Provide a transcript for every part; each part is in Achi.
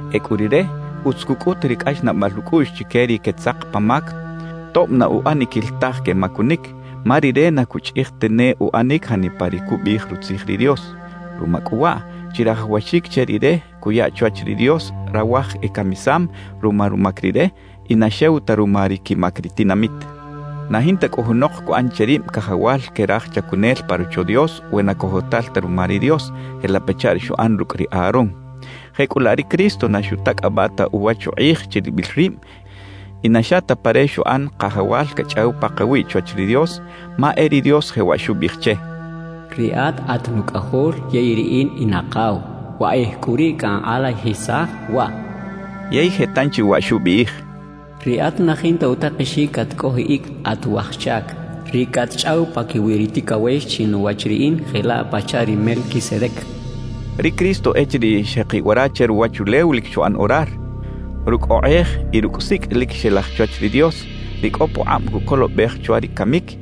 Ecꞌu rire, utz cucꞌut ri cꞌaxnaꞌbal ucꞌuꞌx chique ri quetzak pa mac tob na uꞌaniquil taj quemacunic, ma rire na cuchꞌij tane uꞌanic janipa ri cubiꞌij Rutzij ri Dios. Ruma cꞌu waꞌ, chirajawaxic che rire cuya chwach ri Dios rawaj ecamisam ruma rumac rire y na xew ta ruma ri quimac ri tinamit. Na jinta cꞌu junok cuꞌan che rib cajawal que raj chacunel pa Rocho Dios we na cojotal ta ruma ri Dios, jelaꞌ pachaꞌ ri xuꞌan rucꞌ ri Aarón. Jecꞌulaꞌ ri Cristo na xutacꞌabaꞌ ta uwach ukꞌij chiribil rib y na xa ta pa re xuꞌan Kajawal cachꞌaw pakawiꞌ chwach ri Dios, ma e ri Dios jewaꞌ xubiꞌij che: Riꞌat at Nucꞌajol yey Riꞌin in Akaw; wakꞌij cꞌu riꞌ cankꞌalajisaj waꞌ. Yey je tanchi waꞌ xubiꞌij: Riꞌat na jinta utakexic catcꞌojiꞌic at waj chac, ri catchꞌaw paquiwi ri ticawex chinuwach Riꞌin jelaꞌ pachaꞌ ri Melquisedec xchaꞌ. Ri Cristo echiriꞌ xjekiꞌ wara che ruwachulew lic xuꞌan orar, rucꞌ okꞌej y rucꞌ sicꞌ lic xelaj chwach ri Dios, ri cꞌo pukꞌab cucolobej chwa ri camic;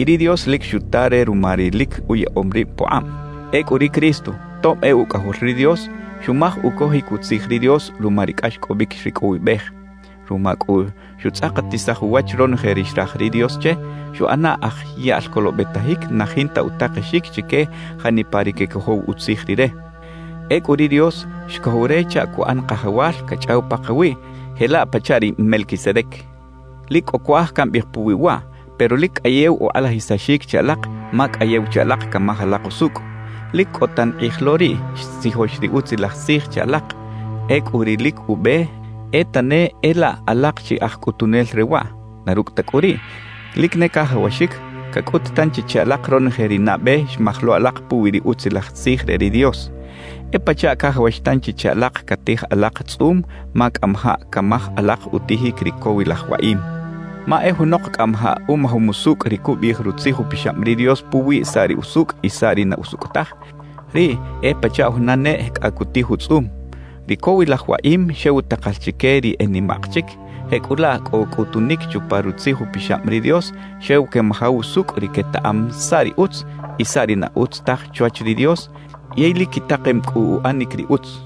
y ri Dios lic xuta re ruma ri lic uyaꞌom rib pukꞌab. Ecꞌu ri Cristo, tob e Ucꞌajol ri Dios, xumaj ucojic utzij ri Dios ruma ri cꞌaxcꞌobic xricꞌowibej. Ruma cꞌu xutzꞌakatisaj uwach ronoje ri xraj ri Dios che, xuꞌana aj yaꞌl colobetajic na jinta utakexic chique janipa ri quecojow utzij Rire. Ecꞌu ri Dios xcojow re chaꞌ cuꞌan Kajawal cachꞌaw pakawiꞌ jelaꞌ pachaꞌ ri Melquisedec. Lic cꞌo cuaj cambiꞌij puwi waꞌ, pero lic cꞌayew ukꞌalajisaxic che alak ma cꞌayew che alak camaj alak usucꞌ. Lic cꞌo tan kꞌij lo riꞌ xtzijox ri Utzilaj Tzij che alak; ecꞌu ri lic ube e tane e laꞌ alak chi aj cꞌutunel re waꞌ. Na rucꞌ ta cꞌu riꞌ, lic ne cajawaxic cacꞌut tanchi che alak ronoje ri nabe xmaj lo alak puwi ri Utzilaj Tzij re ri Dios. E pachaꞌ cajawax tanchi che alak catij alak tzꞌum ma cꞌamajaꞌ camaj alak utijic ri cowilaj waꞌim. Ma e junok cꞌamajaꞌ umajom usucꞌ ri cubiꞌij Rutzij Upixab ri Dios puwi saꞌ ri usucꞌ y saꞌ ri na usucꞌ taj, riꞌ e pachaꞌ juna neꞌ cꞌa cutij utzꞌum. Ri cowilaj waꞌim xew takal chique ri e nimaꞌk chic; jecꞌulaꞌ cꞌo cꞌutunic chupa Rutzij Upixab ri Dios xew quemajaw usucꞌ ri quetaꞌam saꞌ ri utz y saꞌ ri na utz taj chwach ri Dios yey lic quitakem cꞌu uꞌanic ri utz.